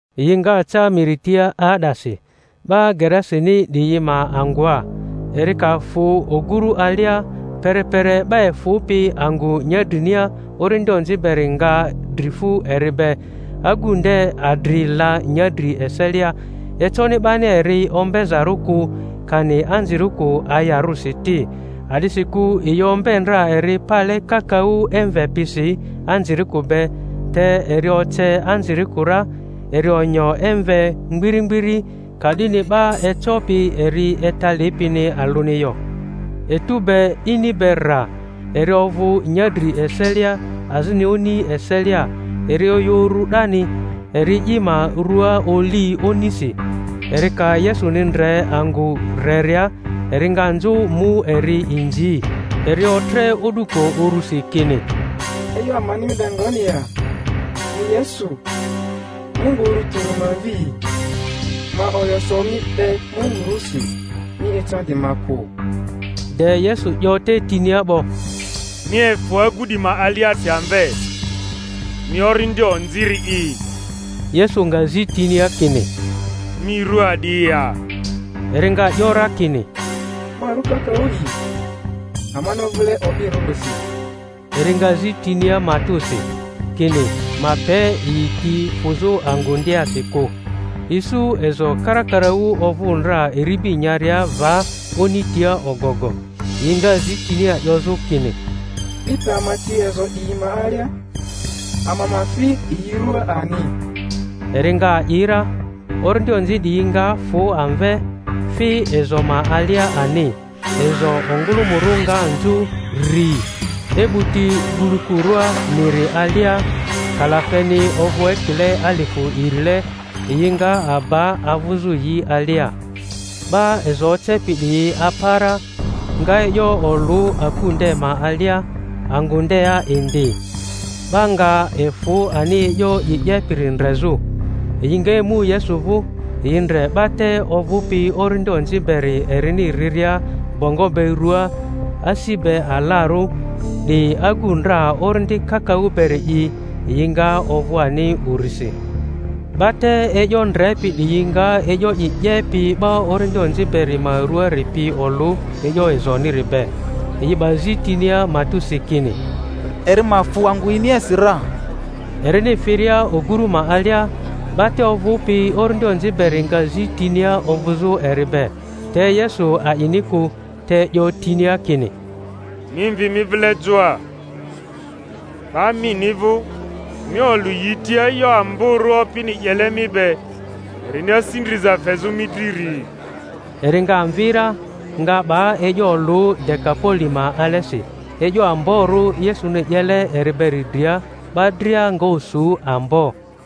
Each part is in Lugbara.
Yi nga ca miri tia 'aa'dasi, ‘ba Gerasini 'diyi ma angᴜa. Eri ka fᴜ ogᴜrᴜ alia, perepere 'ba efᴜpi angᴜ nyadrinia orindi onzi beri nga dri fᴜ eri be; agu nde adri la nyadri eselia, econi 'bani eri ombezarᴜ kᴜ, kani anzirikᴜ ayarᴜsi ti; a'disikᴜ yi ombe ndra eri pale kakaᴜ emve pisi anzirikᴜ be, te eri oce anzirikᴜ ra, eri onyo emve mgbiri mgbiri; ka'dini 'ba ecopi eri etalipini alᴜni yo. Etu be ini be rra, eri ovᴜ nyadri eselia azini oni eselia, eri oyᴜ uru 'dani, eri i ma rua oli onisi. Eri ka Yesuni ndre angᴜ reria, eri nga nzᴜ mu eri inzi; eri otre o'duko urusi kini, E'yo amani mi be ngoni ya, mi Yesu, Mungu Uru Tᴜri ma Mvi'i? Ma oyo so mi be Mungu rusi, mi ecandi ma kᴜ. De Yesu 'yo te tinia 'bo, Mi efᴜ agu 'di ma aliasi amve, mi orindi onziri'i! Yesu nga zi tinia kini, Mi rᴜ a'di ya? Eri nga 'yo ra kini, Ma ru Kakaᴜ'i, amani ovᴜle o'birᴜrisi. Eri nga zi tinia matᴜsi, kini ma pe yi ti fᴜzᴜ angᴜ ndeasi kᴜ. Isu ezo karakaraᴜ ovᴜ ndra iribi nyaria va oni tia ogogo; yi nga zi tinia 'yozᴜ kini, Mi pe ama ti ezo 'diyi ma alia, ama ma fi yi rᴜaa ani. Eri nga a'i ra. Orindi onzi 'diyi nga fᴜ amve, fi ezo ma alia ani; ezo ongᴜlᴜmᴜrᴜ nga nzᴜ rri e'buti gulu-kurᴜa miri alia, kalafeni ovᴜ ekile alifᴜ irile, yi nga aba avᴜzᴜ yi alia. 'Ba ezo ocepi 'diyi apa ra, nga e'yo olᴜ aku nde ma alia, angᴜ ndea indi. 'Ba nga efᴜ ani e'yo i 'yepiri ndrezᴜ. Yi nga emu Yesu vᴜ, yi ndre 'ba te ovᴜpi orindi onzi beri erini riria bongo be ruaa, asi be alarᴜ, 'di agu ndra orindi kakaᴜ beri'i; yi nga ovᴜ ani urisi. 'Ba te e'yo ndrepi 'diyi nga e'yo i 'yepi 'ba orindi onzi beri ma ruaari pi olᴜ e'yo ezoniri be. Yi 'ba zi tinia matᴜsi, kini, eri ma fᴜ angᴜ yiniasi ra. Erini firia oguru ma alia, 'ba te ovᴜpi orindi onzi beri nga zi tinia ovᴜzᴜ eri be. Te Yesu a'ini kᴜ, te 'yo tinia kini, Mi mvi mi vile joa, 'ba mini vᴜ, mi olᴜ yi tia e'yo amborᴜ Opini 'yele mi be, erini asi ndriza fezᴜ mi driri. Eri nga mvi ra, nga 'ba e'yo olᴜ Dekapoli ma alesi, e'yo amborᴜ Yesuni 'yele eri beri dria; 'ba dria nga osu ambo.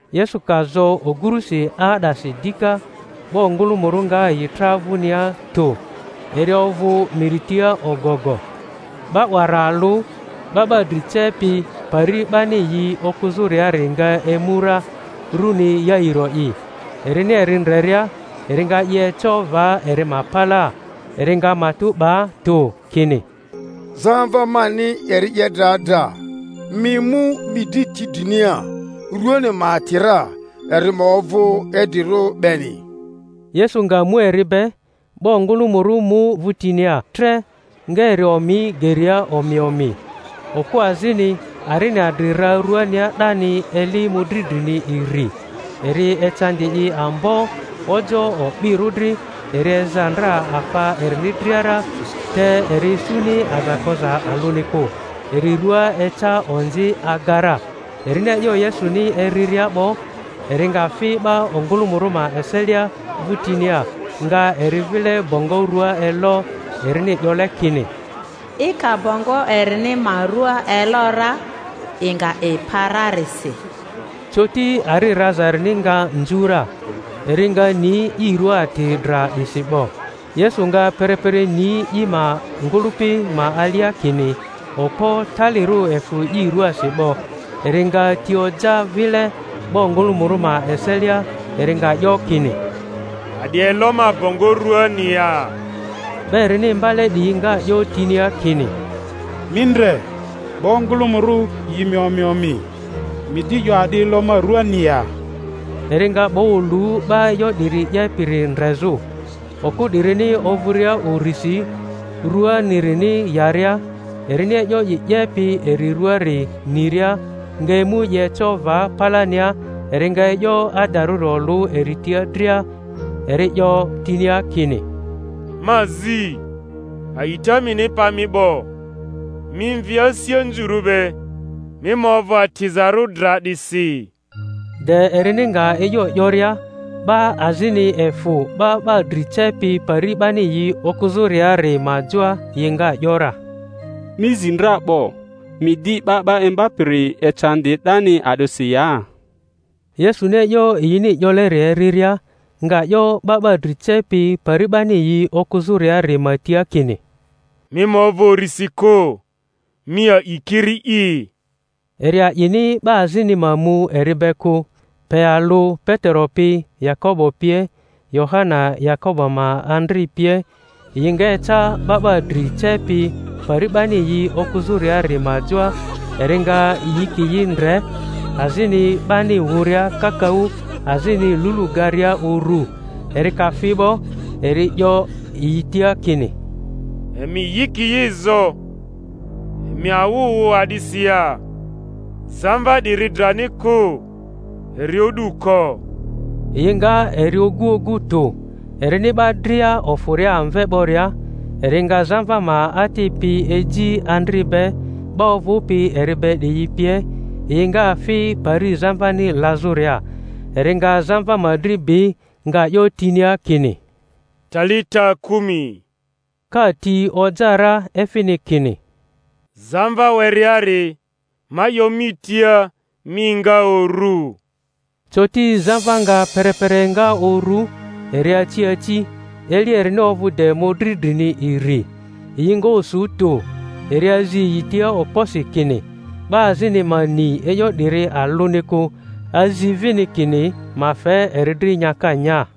Yesu ka zo ogurusi 'aa'dasi dika, 'ba ongᴜlᴜmᴜrᴜ nga yi tra vᴜnia tᴜ; eri ovᴜ miri tia ogogo. 'Ba wara alᴜ, 'ba ‘ba dri cepi pari 'bani yi okᴜzᴜriari nga emu ra, runi Yairo'i; erini eri ndreria eri nga i eco va eri ma palaa, eri nga matᴜ 'ba tᴜ, kini, Zamva mani eri 'ye dra dra. Mi emu mi dri ti drinia, ruani ma ati ra, eri ma ovᴜ idrirᴜ beni. Yesu nga mu eri be. 'Ba ongᴜlᴜmᴜrᴜ mu vᴜtinia tre, nga eri omi geria omi omi. Okᴜ azini, arini adri ra ruania 'dani eli mᴜdri drmi iri, eri ecandi i ambo ojoᴜ o'birᴜ dri, eri eza ndra afa erini dria ra, te eri isuni aza koza alᴜni kᴜ, eri rua eca onzi aga ra, erini e'yo Yesuni eriria 'bo, eri nga fi 'ba ongᴜlᴜmᴜrᴜ ma eselia vᴜtinia, nga eri vile bongo rᴜa elo. Erini 'yole kini, I ka bongo erini ma rua elo ra, i nga i pa rarisi. Coti ari raza erini nga nzu ra. eri nga ni i rua ati dra 'disi 'bo. Yesu nga perepere ni i ma ngᴜlᴜpi ma alia kini okpo talirᴜ efᴜ i ruaasi 'bo, eri nga ti oja vile 'ba ongᴜlᴜmᴜrᴜ ma eselia, eri nga 'yo kini, A'di elo ma bongo ruani ya? 'Ba erini imbale 'diyi nga 'yo tinia kini, Mi ndre, 'ba ongᴜlᴜmᴜrᴜ yi mi omi omi, mi di 'yo, A'di elo ma rᴜani ya? Eri nga 'ba olu, 'ba e'yo 'diri 'yepiri ndrezᴜ. Okᴜ 'dirini ovᴜria urisi, rᴜani-rini yaria, erini e'yo i 'yepi eri ruaari niria, nga emu i eco va palania, eri nga e'yo adarᴜri olᴜ eri tia dria. Eri 'yo tinia kini, Ma zi, a'ita mini pa mi 'bo; mi mvi asi anzurᴜ be, mi ma ovᴜ atizarᴜ dra 'disi. De erini nga e'yo 'yoria, 'ba azini efᴜ 'ba 'ba dri cepi pari 'bani yi okᴜzᴜriari ma joa, yi nga 'yo ra, Mi zi dra 'bo. Mi di 'Ba 'ba Imbapiri ecandi 'dani a'disi ya? Yesuni e’yo yini 'yoleri eriria, nga 'yo 'ba 'ba dri cepi pari 'bani yi okᴜzᴜriari ma tia kini, Mi ma ovᴜ urisi kᴜ, mi a’i kiri'i. Eri a'ini 'ba azini ma mu eri be kᴜ, pe alᴜ Petero pi, Yakobo pie, Yohana Yakobo ma adrl pie. Yi nga eca 'ba 'ba dri cepi pari 'bani yi okᴜzᴜriari ma joa; eri nga yikiyi ndre, azini 'bani wᴜria kakaᴜ, azini lulu garia uru. Eri ka fi 'bo, eri ‘yoyi tia kini, Emi yikiyi zo, emi awᴜ wᴜ a'disi ya? Zamva 'diri drani kᴜ, eri o'du ko. Yi nga eri ogu ogu tᴜ. Erini 'ba dria ofᴜria amve 'boria, eri nga zamva ma ati pi eji andri be, 'ba ovᴜpi eri be 'diyi pie, yi nga fi pari zamvani lazᴜria. Eri nga zamva ma dri bi, nga 'yo tinia kini, Talita kumi; ka ti oja ra efini kini, Zamva wereari, ma 'yo mi tia, mi enga uru. Coti zamva nga perepere enga uru, eri aci aci; eli erini ovᴜ de mᴜdri drini iri. Yi nga osu tᴜ. Eri azi yi tia okposi, kini 'ba azini ma ni e'yo 'diri alᴜni kᴜ, azi vini kini ma fe eri dri nyaka nya.